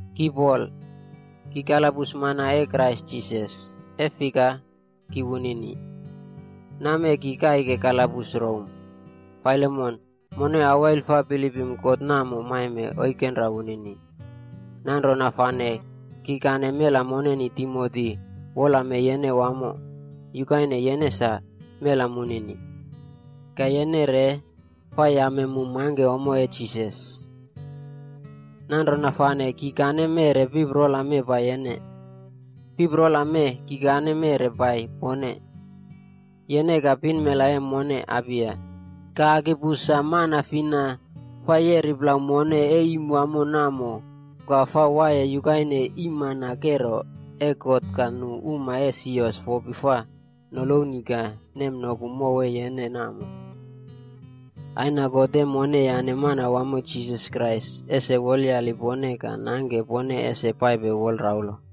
Ki Pol, ki kalabus mana e Krais Jisas e fika, ki wunini. Nam mee ki kaike kalabus Rom. Filemon, mone awail fa bilipme God namo maime oikenra wunini. Nanrona fane kikane mela moneni Timoti wolame yene wamo yukaine yene sa mela munini. Ka yene re fa yame mu mangke ommo e Jisas. Nanrona fane kikane meꞌre piprola mee pai yene. Piprola mee kikane meꞌre pai pone: yene ka pinmela e mone Apia, ka Arkipus sa mana fina fa yeri plau mone e iim wamo namo ka fa waiye yukaine iimmana kero e God ka nu uma e sios fopi fa noloni ka nemnoku mow e yene namo. Aina God e mone yane Manawamo Jisas Krais ese wolyali pone ka nangke pone ese paipe wolraulo.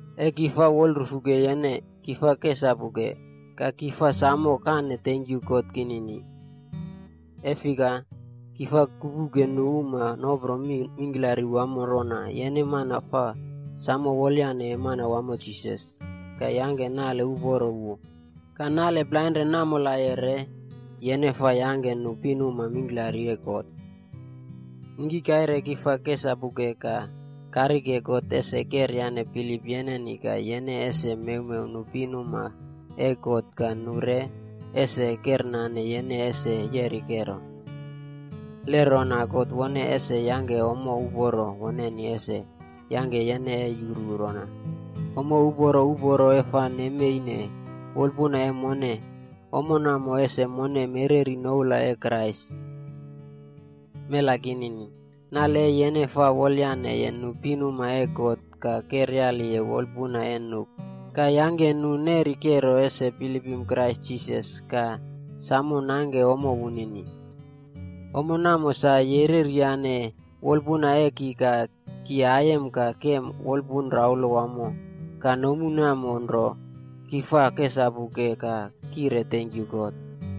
E ki fa wolrufuke yene, ki fa kesapuke, ka ki fa samo kane tenkyu God kinini. E fika, ki fa kupuke nu uma nopro mi mingklari wamo rona yene mana fa samo wolyane Manawamo Jisas, ka yangke nale uporo wu ka nale plainren namolaye re yene fa yangke nu pinuma mingklari e God. Ningkikaire ki fa kesapuke ka karike God ese keryane bilip yeneni ka yene ese mewmew nu pinuma e God ka nu re ese kernane yene ese yeri kero. Le rona God wone ese yangke ommo uporo woneni ese yangke yene e yuru rona, ommo uporo uporo e fa nemeine wolpuna e mone, ommo namo ese mone mereri noula e Krais. Mela kinini, nale e yene fa wolyaneye nu pinuma e God ka keryaliye wolpuna e nu ka yangke nu neri kero ese bilipim Krais Jisas ka samo nangke ommo wunini. Ommo namo sa yereri yane wolpuna e ki ka ki aiyem ka kem wolpun raulo wamo ka nomu namo nro ki fa kesapuke ka kire tenkyu God.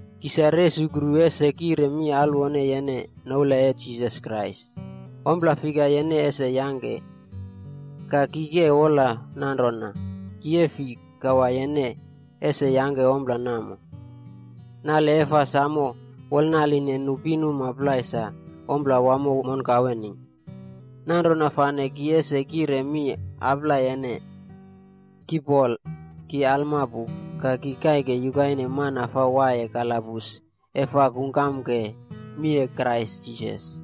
Ki sa resukru ese kire mi alwone yene noula e Jisas Krais, ompla fika yene ese yangke. Ka, ki ke wola nanrona ki e fi kawa yene ese yangke ompla namo. Nale e fa samo wolnaline nu pinuma plai sa ompla wamo monkaweni. Nanrona fane ki ese kire mi aplai yene. Ki Pol, ki alma pu ka ki kaike yukaine mana fa waiye kalabus e fa kungkamke mi e Krais Jisas.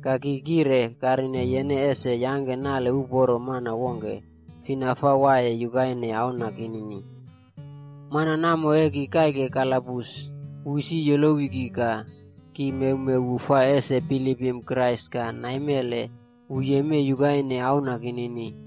Ka ki kire karine yene ese yangke nale uporo mana wongke fina fa waiye yukaine auna kinini. Mana namo e ki kaike kalabus, wu isi yolowi ki ka ki mewmew wu fa ese bilipim Krais ka naimele wu yemei yukaine auna kinini.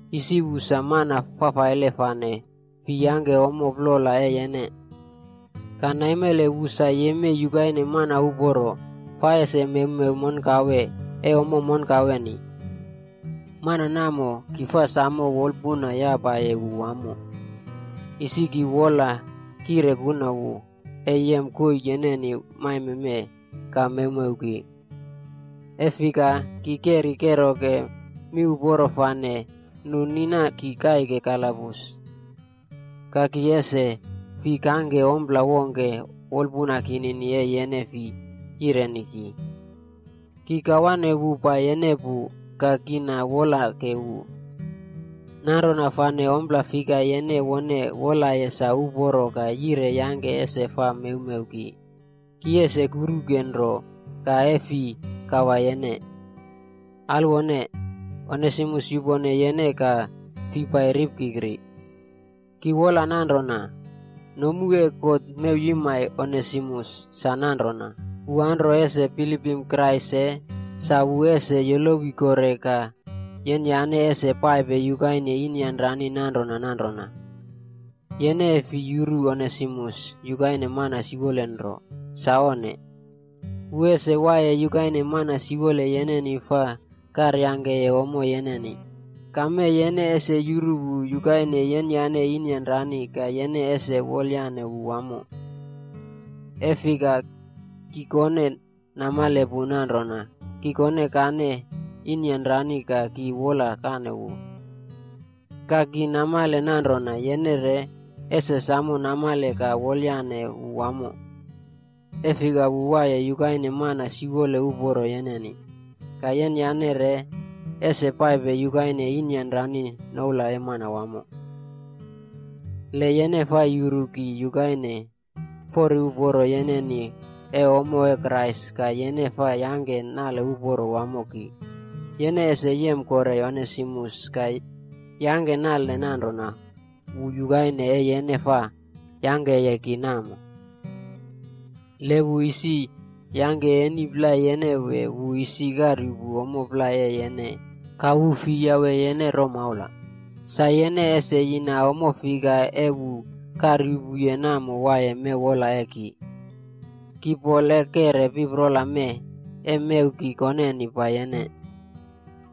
Isi wu sa mana fafaile fane fi yangke ommo plola e yene. Ka naimele wu sa yemei yukaine mana uporo fa ese mewmew monkawea e ommo monkaweni. Mana namo, ki fa samo wolpuna yapaye wu wamo. Isi ki wola kire kuna wu e yem koii yeneni maime mee ka mewmew ki. E fika, ki keri keroke miuporo fane nu nina ki kaike kalabus. Ka ki ese fi kangke ompla wongke wolpuna kinini e yene fi yireni ki. Ki kawane wu pai yene pu ka ki na wolake wu. Nanrona fane ompla fika yene wone wolaye sa uporo ka yire yangke ese fa mewmew ki, ki ese kuruke nro ka e fi kawa yene. Alwone, Onesimus yupone yene ka fi pai ripkikri. Ki wola nanrona, nomu e God mewyimai Onesimus sa nanrona, wu anro ese bilipim Krais se sa wu ese yolowi kore ka yenyane ese paipe yukaine inyanrani nanrona nanrona. Yene e fi yuru Onesimus yukaine mana siwole nro. Sa onne. Wu ese waiye yukaine mana siwole yeneni fa karyangkeye ommo yeneni, ka mee yene ese yuru wu yukaine yenyane inyanrani ka yene ese wolyane wu wamo. E fika, ki kone namale pu nanrona kikonkane inyan rani ka ki wolkane wu. Ka ki namale nanrona yene re ese samo namale ka wolyane wu wamo. E fika wu waiye yukaine mana siwole uporo yenini, ka yenyane re ese paipe yukaine inyanrani noula e Manawamo. Le yene fa yuru ki yukaine fori uporo yeneni e ommo e Krais ka yene fa yangke nale uporo wamo ki, yene ese yem kore Onesimus ka yangke nale nanrona wu yukaine e yene fa yangkeye ki namo. Le wu isi yangke eni plai yene wee wu isi karyuꞌpu ommo plai e yene ka wu fi yawe yene romaula, sa yene ese yina ommo fika e wu karyuꞌpuye namo waiye mew wola e ki. Ki Pol e keꞌre piprola mee e mew ki koneni pai yene.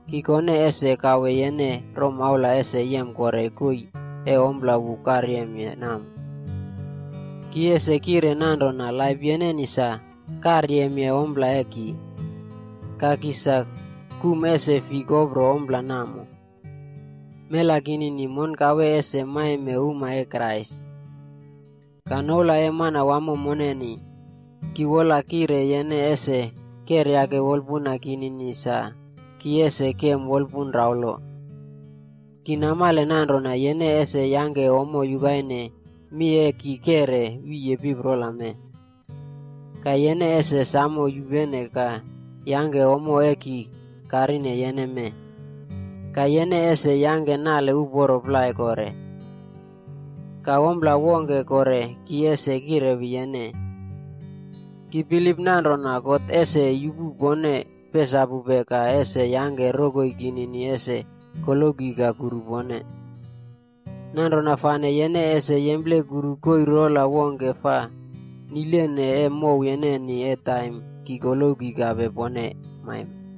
Ki kone ese kawe yene romaula ese yem kore koii e ompla wu karyemye namo. Ki ese kire nanrona laip yeneni sa karyemye ompla e ki.b Ka ki sa kum ese fi kopro ompla namo. Mela kinini, monkawe ese maime uma e Krais. Ka noula e Manawamo moneni, ki wola kire yene ese keryake wolpuna kinini sa ki ese kem wolpun raulo. Ki namale nanrona yene ese yangke ommo yukaine mi e ki keꞌre wiye piprola mee. Ka yene ese samo yupene ka yangke ommo e ki karine yene mee, ka yene ese yangke nale uporo plai kore. Ka ompla wongke kore ki ese kirewi yene. Ki bilip nanrona God ese yupu pone pesapupe ka ese yangke rokoi kinini ese koloki ka kuru pone. Nanrona fane yene ese yemplekuru koii rola wongke fa nilene e mow yeneni e taim ki koloki kape pone maime.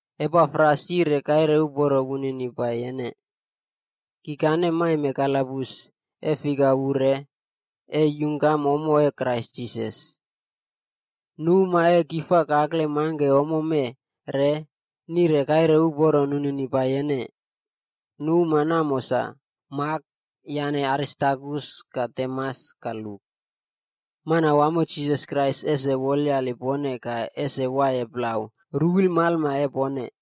Epafras yire kaire uporo wunini pai yene. Kikane maime kalabus e fika wu re e yungkam ommo e Krais Jisas. Nu uma e ki fa kakle mangke ommo mee re, nire kaire uporo nunini pai yene. Nu uma namo sa: Mak yane Aristarkus ka Demas ka Luk. Manawamo Jisas Krais ese wolyali pone ka ese waiye plau ruwilmalma e pone.